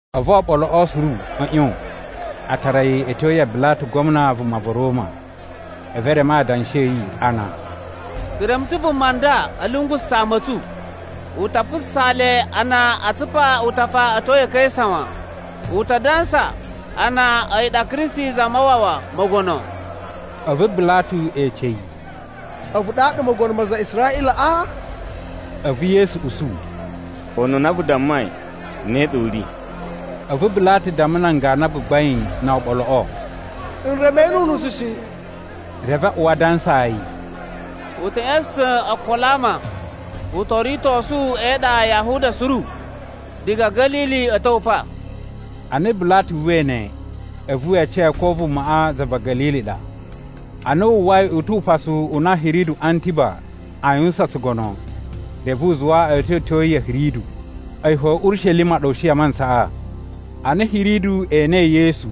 A̱vu oɓoloꞌo suru a̱ ꞌyon a tara yi a̱ tyo ya Bilatu Gwamna vuma va̱ Roma. A̱vu e reme adanshi a̱ yi ana, “Tsu reme ta̱ vuma nda a̱ lungususa̱ ama a̱ tsu. U ta putsusaa le a na aa tsupa utafa a̱ tyo ya̱ Kaisa wan. U ta dansa, a na a̱yi ɗa Kristi Zamawawa, mogono.” A̱vu Bilatu ece yi, “A̱vu ɗaɗa mogono ma aza a Israꞌilaꞌa?” A̱vu Yesu usu, “Ununa vu dammai ne ɗa u ri.” A̱vu Bilatu damma nan ganu a gbagbain no oɓoloꞌo, “N reme yi nu unusu shi.” Reve a uwa a dansaa yi, “U ta̱ ꞌya̱sa̱sa̱n okolo a ama, u to ritosu e iɗa ya Yahuda suru, diga Ga̱lili a̱ ta̱wa̱ pa.” Ana Bilatu uwwai ne, a̱vu we ece ko vumaꞌa za va̱ Ga̱lili ɗa. Ana wu uwwai u tu upasu u na Hiridu Antiba aa yuwusan tsugono, reve u zuwa a̱ tyowetyo yi ya̱ Hiridu. A̱yi fo Urishelima ɗa u shi a mantsaꞌa. Ana Hiridu enei Yesu,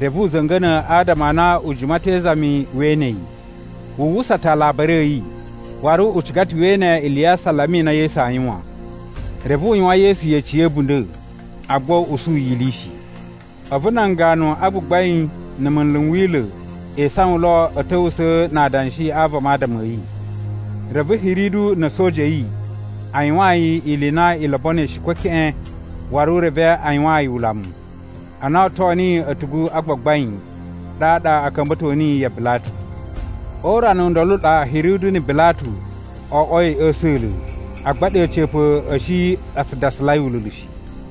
reve u za̱nga̱na̱ adama a na u jima ta̱ e izami we ene yi. Wu uwwusa ta̱ alabari a̱ yi, waru u ciga ta̱ we ene ili ya asalama i na Yesu aa yuwan. Reve u yuwan Yesu yeci ya̱ a̱bunda̱, agba u usu yi ili shi. A̱vu nan ganu a gbagbain na̱ munlu n Wila̱ e isawan lo a̱ ta̱wusa̱a̱ na adanshi a vama adama a̱ yi. Reve Hiridu na̱ a̱soja a̱ yi a yuwaan yi ili i na i lobonoi shi ko keꞌen, waru reve a yuwaan yi ulamu. Ana o oto niyi a̱tugu a gbagbain, ɗaɗa a̱ ka̱mba̱to niyi ya Bilatu. O urana u ndolo u ɗa Hiridu na̱ Bilatu o oꞌwoi a̱ a̱sa̱la̱, agba ɗe a̱ca̱pa̱ a̱ shi a tsu dasalai ululu shi.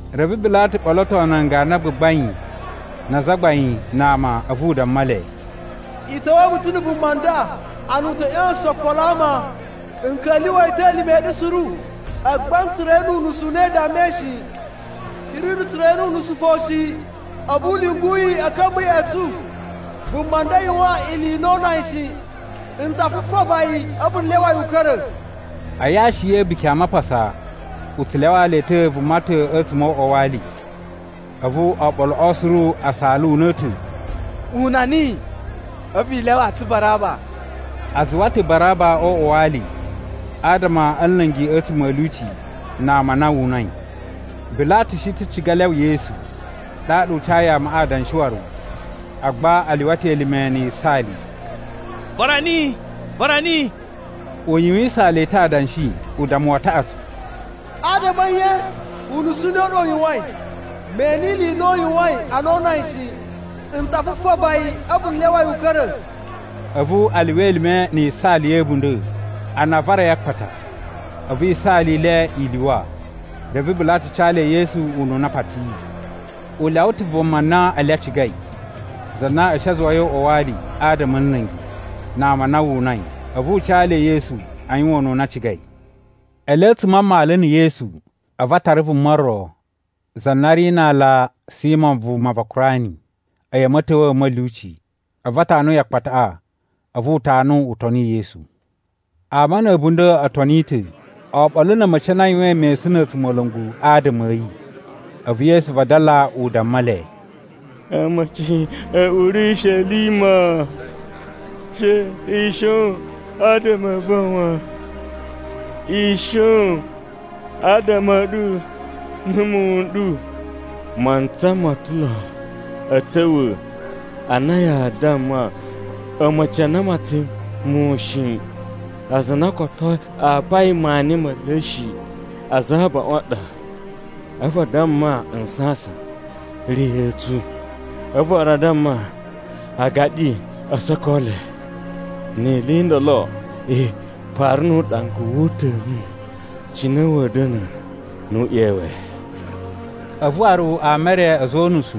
Reve Bilatu ɓoloto nan ganu a gbagbain na azagbain na ama, a̱vu u damma le, “I ta̱wa̱a̱ mu ta̱ na̱ vuma nda, ana u ta̱ ꞌya̱sa̱sa̱n okolo a ama, n ka̱lyuwa̱ yi ta̱ elime a̱ ɗu suru, agba n tsura̱ yi nu unusu u na i dammai shi. Hiridu tsura̱ yi nu unusu fo shi, a̱vu u lyungu yi a̱ ka̱mba̱ ya̱ꞌa̱ tsu. Vuma nda yuwan ili i na oo una yi shi. N ta fufaba yi, a̱vu n lyawa yi u ka̱ra̱.” [ A yashi ya̱ A̱buki a Mapasa u tsu lyawaa le ta̱ vuma ta̱ a̱tsuma̱ o uꞌwa wa ali.] A̱vu oɓoloꞌo suru a saala una̱ta̱, “Una niyi! A̱vu i lyawaa tsu Baraba!” (A zuwa ta̱ Baraba o uꞌwa wa ali, adama a̱ nla̱ngi a̱tsuma̱ a̱ lyuci, na ama a na wu unai.) Bilatu shi ta̱ ciga lyawa Yesu, ɗaɗa u cayi amaꞌa adanshi waru. Agba a lyuwa ta̱ elime na̱ yisaali, “Vara niyi! Vara niyi!” U yuwisaan le ta̱ adanshi, udammu wa taꞌatsu, “Adama a̱ nye? Unusu u ne u ɗa u yuwain? Me ene ili i na u yuwain ana oo una yi shi! N ta fufaba yi a̱vu n lyawa yi u ka̱ra̱.” A̱vu a lyuwa elime na̱ yisaali ya̱ a̱bunda̱, a na a vara yi a akpata. A̱vu yisaali i le i lyuwa. Reve Bilatu ca le Yesu ununa a patiyi. U lyawa ta̱ vuma na ele a cigai, za na a̱ shi a zuwai o uꞌwa wa ali, adama a̱ nla̱ngi, na ama a na wu unai. A̱vu u ca le Yesu a yuwan ununa a cigai. Ele a̱tsuma̱ a mmalu na̱ Yesu, a̱vu a tara vuma ro, za na ri na aala Simo vuma va Kurani, a̱yi a̱ ma̱ta̱wa̱a̱ a̱ ma̱lyuci. A̱vu a tanu yi akpataꞌa, a̱vu u tanu u toni Yesu. Ama na̱ a̱bunda̱ o toni ta̱, oɓolo na̱ a̱ma̱ci a na a yuwain mesun na̱ a̱tsumola̱ngu adama a̱ yi. A̱vu Yesu vadala u damma le, “A̱ma̱ci a̱ Urishelima, she i shon adama a̱ va̱ wan. I shon adama a̱ ɗu na̱ muwun n ɗu. Mantsa mo ta̱ lo a̱ ta̱wa̱ a na yaa damma, ‘A̱ma̱ci a na a matsain muwun shi, aza a na koto a apai maani me le shi aza a abaꞌun a ɗa.’ A̱vu ‘a damma nsasan, “Riya̱a̱ tsu!” A̱vu waru a damma agaɗi o soko le.’ Ni ili i ndolo i fara nu uɗanga wu uta̱nu, cine wa̱a̱ da̱na̱ nu u ꞌyewe?” A̱vu waru ama e re a̱za̱ o unusu,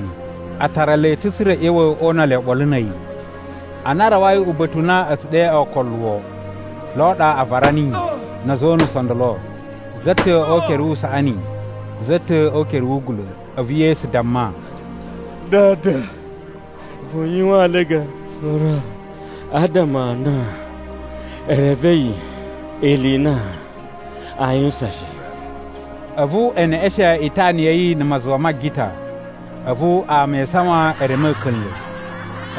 a tara le ta̱ tsa̱ra̱ a̱ ꞌya̱wa̱ o una le oɓolo na̱ a̱yi. Ana a rawai uba̱ta̱ u na a̱ tsu ɗe Ookoluwo, lo ɗa a vara niyi, na̱ a̱za̱ o unusu o ndolo, za ta̱ o ukere wu usaꞌani, za ta̱ o ukere wu ugula̱. A̱vu Yesu damma, “Dada, vu yuwaan le gafura, adama a na e revei ili i na aa yuwusan shi.” A̱vu e neꞌeshen itana ya̱ yi na̱ mazuwa ma agita. A̱vu ama e isawan e reme a̱ka̱nla̱.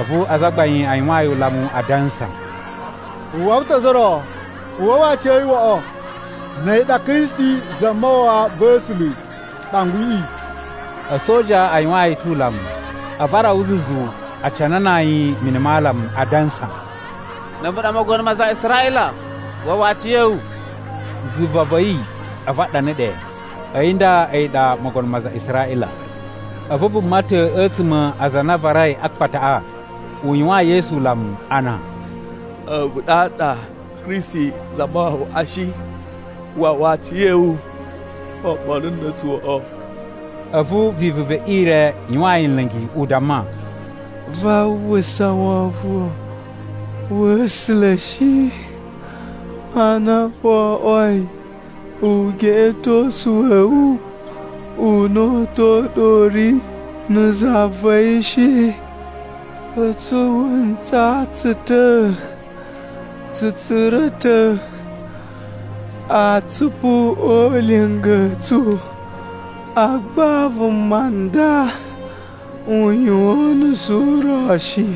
A̱vu azagbain a yuwaan yi ulamu, adansa, “U wawa ta̱ ozo o ro, u wawa aciya̱yi woꞌo, na̱ a̱yi ɗa Kristi Zamawawa va̱ A̱sula̱ Ɗangwiꞌi.” A̱soja a yuwaan yi ta̱ ulamu. A̱vu a rawa zuzu a canana yi mini ma alamu, adansa, “Na̱ a̱vu ɗa mogono ma aza a Israꞌila, wawa aciya̱wu!” Zuva va̱ a̱yi, a̱vu a ɗana ɗe, A̱yi nda a̱yi ɗa mogono ma aza a Israꞌila. A̱vu vuma ta̱ a̱tsuma̱ a aza a na a varai a akpataꞌa, u yuwaan Yesu ulamu ana, “A̱vu ɗaɗa Kristi Zamawawaꞌa shi? Wawa aciya̱wu oɓolo na̱ a̱tsu woꞌo.” A̱vu vivu ve ire yuwaan yi nla̱ngi, u damma, “Vaa uwwusa wovon wa̱ A̱sula̱ shi, ana wo oꞌwoi ugeꞌetosu wa̱ wu una̱ta̱ u ɗa u ri na̱ za va̱ yi shi? A̱tsu wu ntsaa tsu ta̱, tsu tsura̱ ta̱ atsupu o ulinga a̱ tsu, agba vuma nda u yuwan unusu u ro shi.”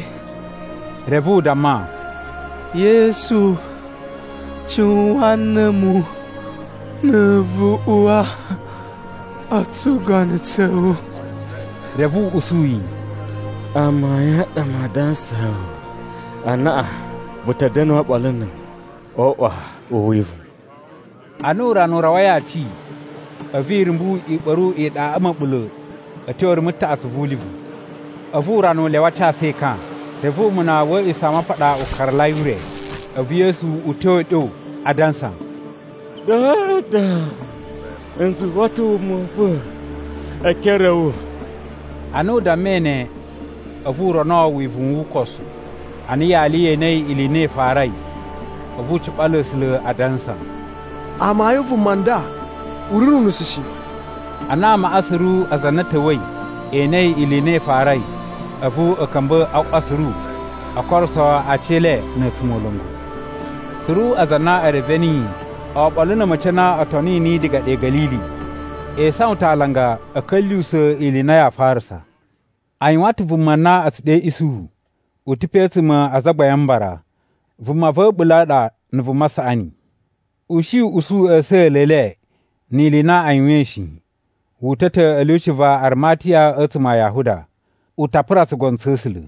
Reve u damma, “Yesu, cuwan na̱ a̱mu, na̱ vu uwa o tsugono tsa̱ wu.” Reve u usu yi, “Amayun a ɗa maa dansaa wu, anaꞌan vu ta̱ da̱na̱ oɓolo na̱ a̱mu o uꞌwa u wivuwun.” Ana urana u rawai aci, a̱vu irumbu i ɓa̱ru iɗaꞌa ma̱ɓula̱ a̱ tyo rumu taꞌatsu vu ulivu. A̱vu urana u lyawa a casu ekan. Reve umuna wa̱ A̱a̱ꞌisamapaɗa u karalai ure. A̱vu Yesu uta̱a̱ uɗyo, adansa, “Dada, n zuwa ta̱ wuma u va̱ e ekere a̱ wu.” Ana u dammai ne, a̱vu u rono wivuwun wu ukosu. Ana yali ye enei ili i na i farai, a̱vu u ciɓala A̱sula̱ adansa, “Amayun vuma nda u ri nu unusu shi!” Ana amaꞌa suru aza a na a̱ ta̱wa̱i e enei ili i na i farai, a̱vu a̱ ka̱mba̱ a ꞌwa suru, o koruso aci e le na̱ a̱tsumola̱ngu. Suru aza a na e reve niyi, oɓolo na̱ a̱ma̱ci a na o toni niyi diga ɗe Ga̱lili, e isawan ta̱ alanga a̱ ka̱lyuwusa̱ ili i na yaa farasa. A yuwan ta̱ vuma na a̱ tsu ɗe Isuhu, u ta̱ pe a̱tsuma̱ a Azagbain a Mbara, vuma va̱ a̱ɓula̱ a ɗa na̱ vuma saꞌani. U shi u usu a̱sa̱la̱ e le, ni ili i na a yuwain shi. Wu uta̱ ta̱ a̱ lyuci va Arimatiya a̱tsuma̱ a Yahuda. U ta pura tsugono tsa̱ A̱sula̱.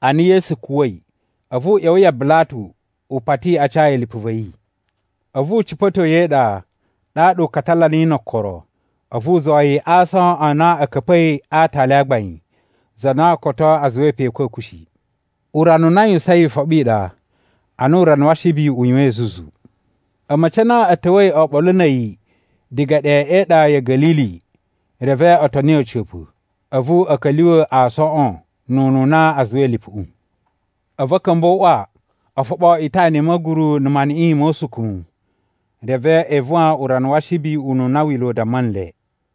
Ana Yesu kuwa̱i, a̱vu u ꞌya̱wa̱ ya Bilatu u pati a ca yi lipu va̱ yi. A̱vu u cipa̱to yi e iɗa, ɗaɗa u katala niyi no okoro. A̱vu u zuwa yi a aason a na a̱ ka̱pa̱i a aatali a gbain, za na koto a zuwai pe a̱kwa̱kwa̱ shi. Urana u na a yuwusain Ifoɓi i ɗa, ana urana wa Ashibi u yuwain zuzu. A̱ma̱ci a na a̱ ta̱wa̱i oɓolo na̱ a̱yi diga ɗe e iɗa ya̱ Ga̱lili, reve o toni a̱ca̱pa̱, a̱vu a̱ ka̱lyuwa̱ aasoꞌon nu ununa a zuwai lipuꞌu. A̱vu a̱ ka̱mba̱ o uꞌwa o foɓo itana i ma̱guru na̱ maniꞌin mo usukumu. Reve e ivuwan urana wa Ashibi ununa Wila̱ u damma nle.